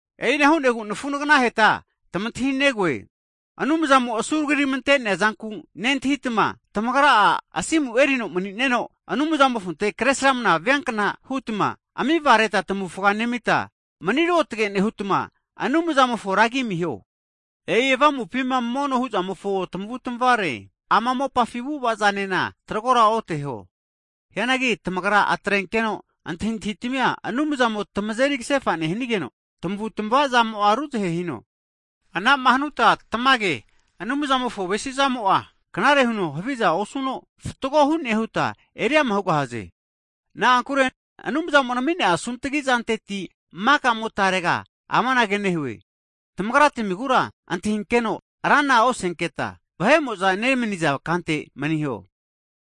E'ina hu'negu, nafu'naganaheta tamantahinegoe, Anumzamo'ma asuragiramante'nea zanku nentahitma, tamagra'a asimu erino mani'neno, Anumzamofonte Kresramana viankna hutma amivareta tamavufa nemita, mani ruotge nehutma, Anumzamofo ragi amiho. E'i avamupima mono hu'zamofo tamavutmavaza mene. Hagi ama mopafi avu'avazanena tagrora oteho. Hianagi tamagra atrenkeno antahintahitamia Anumzamo tamazeri kasefa nehanigeno, tamavutamava zamo'a ruzahe hino. Anama hanuta, tamage Anumzamofo avesizamo'a, knare huno haviza osuno, fatgo hu'ne huta eriama hugahaze. Na'ankure Anumzamo'ma asunkuzama'areti asumaraginantenereti, maka motarega amanage nehue, tamagratmigura antahinkeno rana osenketa, vahe'mo'za nemaniza kante maniho.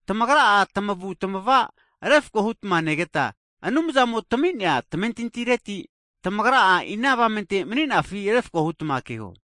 Tamagra'a tamavutamava refako hutma negeta, Anumzamo tamami'nea tamentintireti, tamagra ina avamente mani'nafi refko hutma keho.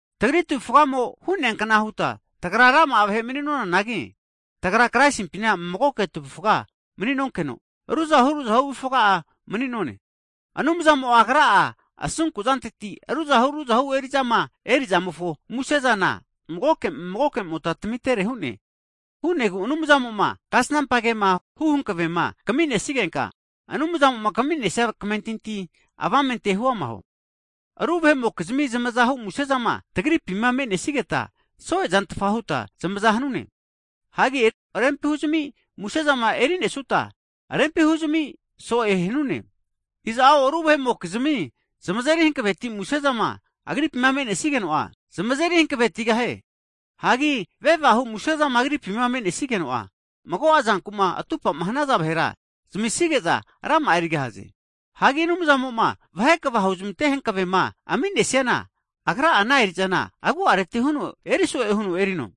Tagri tavufgamo hu'neankna huta tagra rama'a vahe mani'nonanagi, tagra Kraisimpina magoke avufga mani'neta, ruzahu ruzahu avufga'a mani'none. Anumzamo'a Agra'a asunkuzanteti, ruzahu ruzahu eri'zama eri'zamofo muse'zana magoke magoke'mota tamitere hu'ne. Hu'negu Anumzamo'ma kasnampa kema hu hankavema kaminesigenka, Anumzamo'ma kami'nesia kamentinti avamente huama huo. Hagi ru vahe'mokizmi zamazahu musezama tagripima me'nesigeta, so'e zantfa huta zamaza hanune. Hagi rempi huzame musezama erinesuta, rempi huzami so'e hanune. Iza'o ru vahe'mokizmi zamazeri hankaveti musezama agripima me'nesigeno'a, zamazeri hankavetigahie. Hagi vevahu musezama agripima me'nesigeno'a, mago'a zankuma atupama hanaza vahera zamisige'za rama'a erigahaze. Hagi Anumzamo'ma vahe kva huzamante hankavema aminesiana, agra'a ana eri'zana agu'areti huno eriso'e huno erino.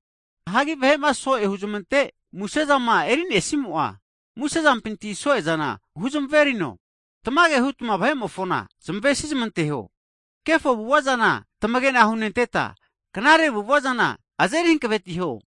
Hagi vahe'ma so'e hunte musezama erinesimo'a, musezampinti so'e zana huzmaverino. Tamage hutma vahe'mofona zmavesizmanteho. Kefo avu'ava zana tamagena hunenteta, knare avu'ava zana azeri hankavetiho.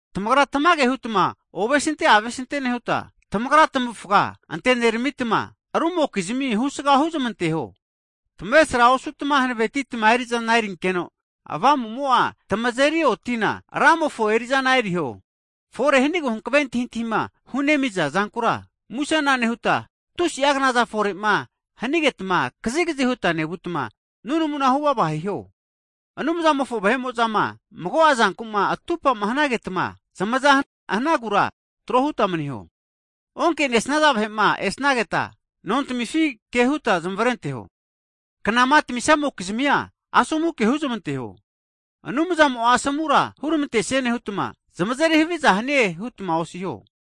Tamagra tamage hutma ovesinte avesinte nehuta, tamagra tamavufga anteneramita arumokizmi husga huzamanteho. Tamavesra osutma hanavetitma eri'zana erinkeno, Avamumo'a tamazeri otina Ramofo eri'zana eriho. Fore hanigu hankave antahintahima hunemiza zankura musena nehuta, tusi'a knazama fore'ma hanigetma kazikazi huta nevutma nunamu huvava hiho. Anumzamofo vahe'mo'zama mago'a zankuma atupa hanagetama, zamazama hanagura tro huta maniho. Onkenesnaza vahe'ma esnageta nontamifi kehuta zamavarenteho. Knama tamisamokizmia asomu ke huzmanteho. Anumzamo'a asomu huramantesie nehutma, zamazeri haviza hanie hutma osiho.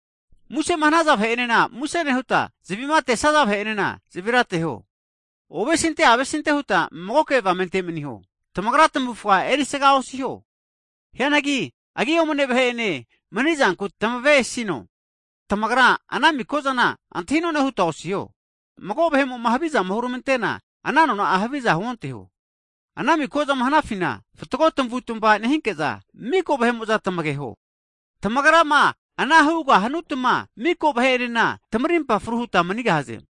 Musema hanaza vahe'enena muse nehuta, zavi'ma atesnaza vahe'enena zavira ateho. Ovesinte avesinte huta magoke avamente maniho. Tamagra tamavufga erisaga osiho, hianagi agi omane vahe'ene manizanku tamavesino. Tamagra ana miko'zana antahi'none huta osiho. Mago vahe'mo'ma havizama huramantena, ana nona'a havizana huonteho. Ana mikozama hanafina fatgo tamavutmava nehinke'za, miko vahe'mo'za tamageho. Tamagrama ana hanutma, miko vahe'enena tamarimpa fru huta manigahaze.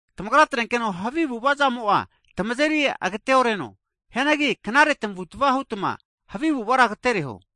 Tamagra atrenkeno havi avu'avazamo'a tamazeri agate'oreno, hianagi knare tamavutamava hutma havi avu'avara agatereho.